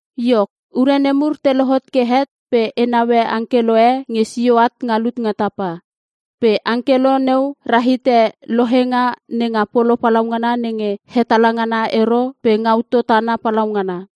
Iok, ure nemur te lohot ke het pe e naue angkelo e nge sio at nga lut nga tapa. Pe angkelo neu rahite lohenga nenga polo palaungana nenge hetala ngana ero pe ngautou tana palaungana.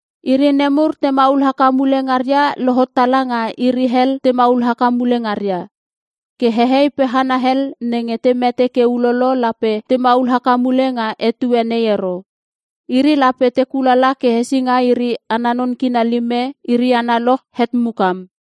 Iri nemur te maul haka mule ngaria lohot tala nga iri hel te maul haka mule ngaria.(Ke hehei pe hana hel nenge te mete ke ulolo lape te maul haka mule nga etue nei ero. Iri lape te kulala ke hesinga iri ana non kina lime iri analoch het mukam.)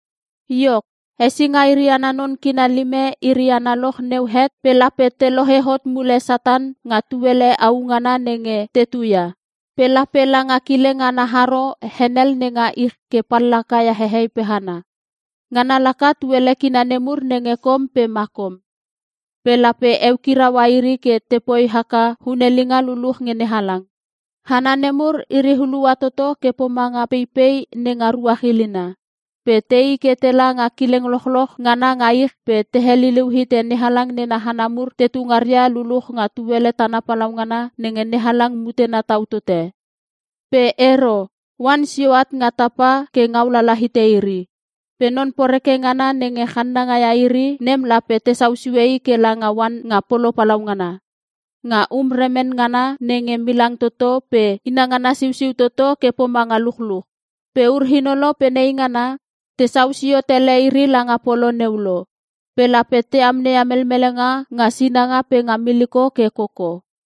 Iok, hesinga iri ana non kina lime iri analoch neu het pe lape te lohe hot mule Satan nga tuele au ngana nenge tuteu ia. Pe lape langa kileng ana haro henel nenga ich ke pallaka ia hehei pe hana. Ngana laka tuele kina nemur nenge Kom pe Makom. Pe lape eukiraua iri ke tepoi haka hunelinga luluch nge NeHalang. Hana nemur iri hulua toto ke pomanga peipei nenga ruach ilina. Pe tei ke tela nga kileng lochloch ngana nga ich pe te heliliu hite NeHalang nena hana mur tetu ngaria luluch nga tuele tana palaungana nenge NeHalang mutena tau tote. Pe ero, oan sio at nga tapa ke ngaulala hite iri. Pe non poreke ngana nenge channanga ia iri nem lape tesau sue i ke langa oan nga polo palaungana. Nga um remen ngana nenge milang toto pe inangana siusiu toto ke pomanga luchluch. Pe ur-inolo pe neingana, tesau sio tele iri langa polo neu lo. Pe lape te amneia melmelenga nga sinanga pe nga miliko ke koko.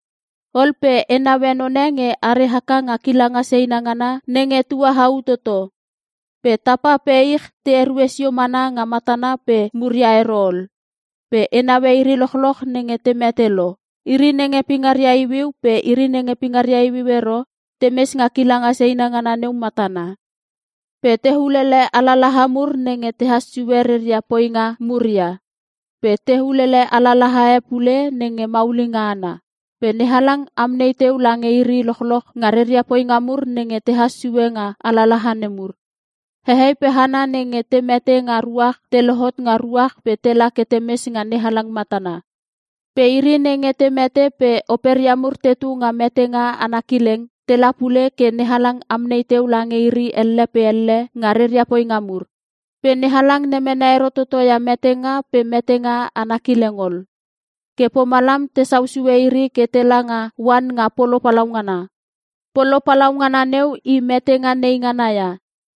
Ol pe e naue none nge are haka nga kilanga seina ngana nenge tuahau toto. Pe tapa pe ich te erue sio mana nga matana pe muria ero ol. Pe e naue iri lochloch nenge te mete lo. Iri nenge pingaria iuiu pe nenge pingaria iuiu ero, temes nga kilanga seina ngana neu matana. Pe te ulele alalaha mur nenge tehas sue reria poinga mur ia. Pe te ulele alalaha e pule nenge maulinga ana. Pe NeHalang amnei teu lange iri lochloch nga reria poinga mur nenge tehas sue nga alalaha nemur. Hehei pe hana nenge te mete nga ruach te lohot nga ruach pe tela ke temes nga NeHalang matana. Pe iri nenge te mete pe operia mur tetu nga metenga ana kileng, tela pule ke NeHalang amnei teu lange iri elle pe elle nga reria poinga mur. Pe NeHalang lemene ero toto ia Metenga pe Metenga Ana Kileng ol. Ke pomalam tesau sue iri ke tela nga oan nga polo palaungana. Polo palaungana neu i metenga nei ngana ia.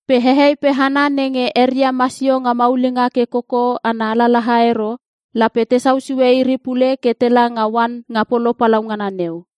Pe hehei pe hana nenge eria masio nga maulinga ke koko ana alalaha ero, lape tesau sue iri pule ke tela nga oan nga polo palaungana neu.